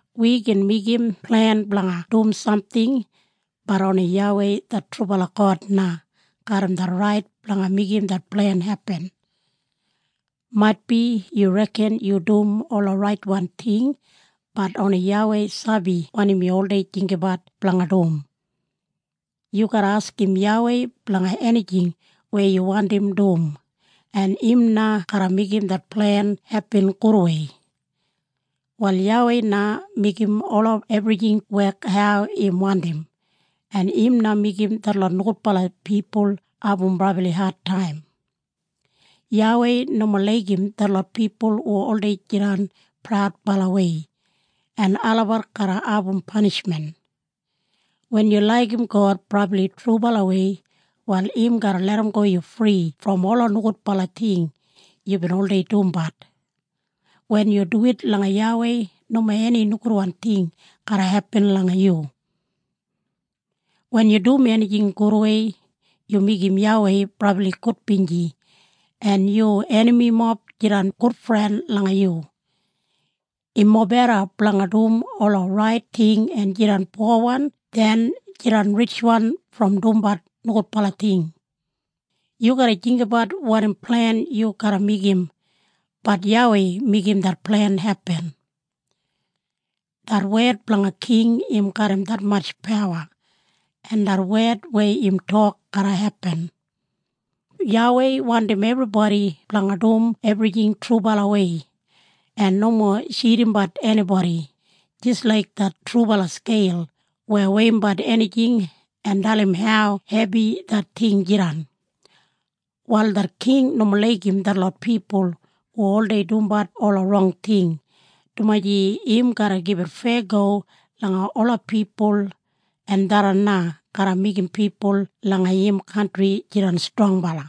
Wi gin meigim plen blanga dum samting, bat oni YAWEI det trubala God na garram det rait blanga meigim det plen hepin. Maitbi yu reken yu dum ola raitwan ting, bat oni YAWEI sabi wanim yu oldei jinggabat blanga dum. Yu garra askim YAWEI blanga enijing weya yu wandim dum, en im na garra meigim det plen hepin gudwei. Wal YAWEI na meigim ola ebrijing wek hau im wandim, en im na meigim detlot nogudbala pipul abum brabli adtaim. YAWEI nomo laigim detlot pipul hu oldei jidan praudbalawei, en olabat garra abum panishmen. Wen yu laigim God brabli trubalawei, wal im garra larramgo yu fri brom ola nogudbala ting yubin oldei dumbat. Wen yu duwit langa YAWEI nomo eni nogudwan ting garra hepin langa yu. Wen yu dum enijing gudwei, yu meigim YAWEI brabli gudbinji, en yu enamimob jidan gudfren langa yu. Im mobeda blanga dum ola rait ting en jidan powan den jidan ritjwan brom dumbat nogudbala ting. Yu garra jinggabat wanim plen yu garra meigim, bat YAWEI meigim det plen hepin. Det wed blanga king im garram detmatj pawa, en det wed weya im tok garra hepin. YAWEI wandim ebribodi blanga dum ebrijing trubalawei en nomo tjidimbat enibodi, jis laik det trubala skeil weya weiyimbat enijing en dalim hau hebi det ting jidan. Wal det king nomo laigim detlot pipul hu oldei dumbat ola rong ting, dumaji im garra gibit feyago langa ola pipul en tharran na garra meigim pipul langa im kantri jidan strongbala.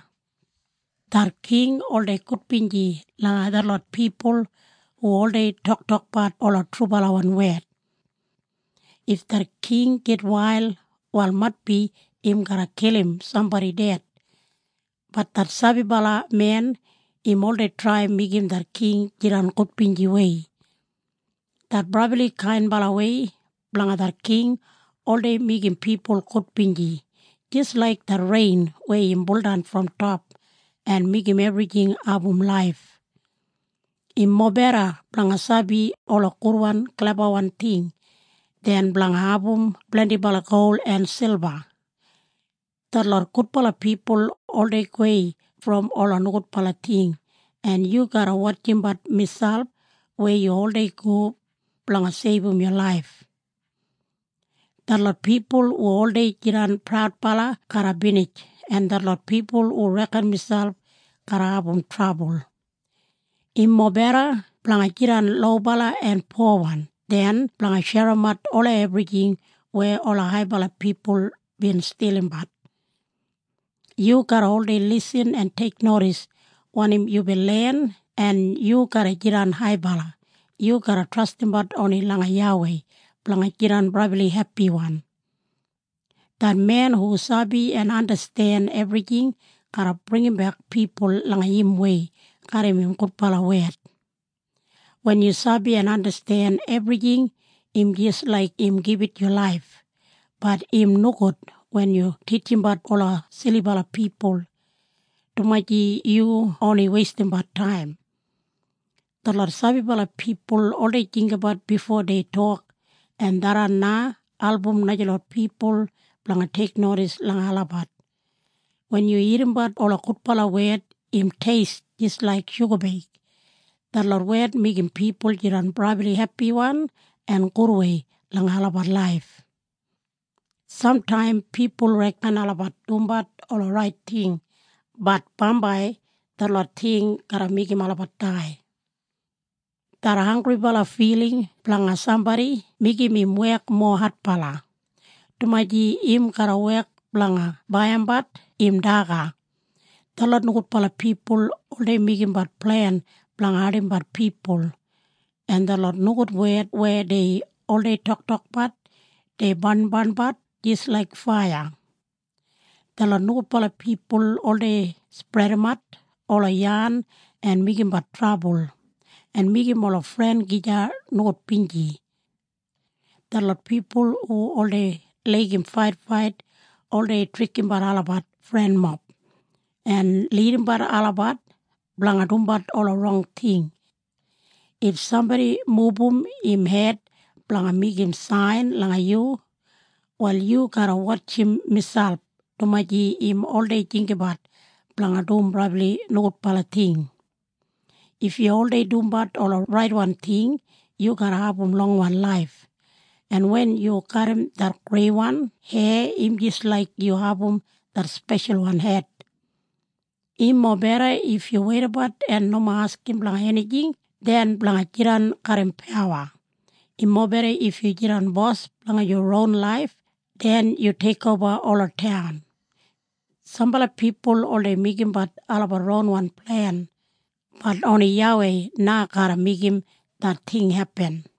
Det king oldei gudbinji langa detlot pipul hu oldei toktokbat ola trubalawan wed. If det king gitwail wal maitbi im garra kilim sambodi ded, bat det sabibala men im oldei trai meigim det king jidan gudbinjiwei. Det brabli kainbalawei blanga det king oldei meigim pipul gudbinji, jis laik det rein weya im buldan brom top en meigim ebrijing abum laif. Im mobeda blanga sabi ola gudwan klebawan ting den blanga abum blendibala gol en silba. Detlot gudbala pipul oldei gowei brom ola nogudbala ting, en yu garra wotjimbat miselp weya yu oldei go, blanga seibum yu laif. Detlot pipul hu oldei jidan praudbala garra binij, en detlot pipul hu reken miselp garra abum trabul. Im mobeda blanga jidan lobala en powan den blanga sherimbat ola ebrijing weya ola haibala pipul bin stilimbat. Yu garra oldei lisin en teiknodis wanim yubin len en yu garra jidan haibala. Yu garra trastimbat oni langa YAWEI blanga jidan brabli hepiwan. Det men hu sabi en andasten ebrijing garra bringimbek pipul langa im wei garram im gudbala wed. Wen yu sabi en andasten ebrijing im jis laik im gibit yu laif, bat im nogud wen yu titjimbat ola silibala pipul, dumaji yu oni weistimbat taim. Detlot sabibala pipul oldei jinggabat bifo dei tok en tharran na album najalot pipul blanga teiknodis langa olabat. Wen yu irrimbat ola gudbala wed im teist jis laik shugabeig. Detlot wed meigim pipul jidan brabli hepiwan en gudwei langa olabat laif. Samtaim pipul reken olabat dumbat ola rait ting, bat bambai detlot ting garra meigim olabat dai. Det hanggribala filing blanga sambodi meigim im wek mowa adbala, dumaji im garra wek blanga baiyimbat im daga. Detlot nogudbala pipul oldei meigimbat plen blanga ardimbat pipul, en detlot nogud wed weya dei oldei toktokbat, dei barnbarnbat jis laik faiya. Detlot nogudbala pipul oldei spredimat ola yan en meigimbat trabul, en meigim ola fren gija nogudbinji. Detlot pipul hu oldei laigim faitfait oldei trikimbat olabat frenmob, en lidimbat olabat blanga dumbat ola rong ting. If sambodi mubum im hed blanga meigim sain langa yu, wal yu garra wotjim miselp, dumaji im oldei jinggabat blanga dum brabli nogudbala ting. If yu oldei dumbat ola raitwan ting, yu garra abum longwan laif. En wen yu garram det greiwan heya im jis laik yu abum det speshalwan het. Im mobeda if yu weidabat en nomo askim blanga enijing den blanga jidan garram pawa. Im mobeda if yu jidan bos blanga yu ron laif den yu teikoba ola taun. Sambala pipul oldei meigimbat olabat ronwan plen, bat oni YAWEI na garra meigim det ting hepin.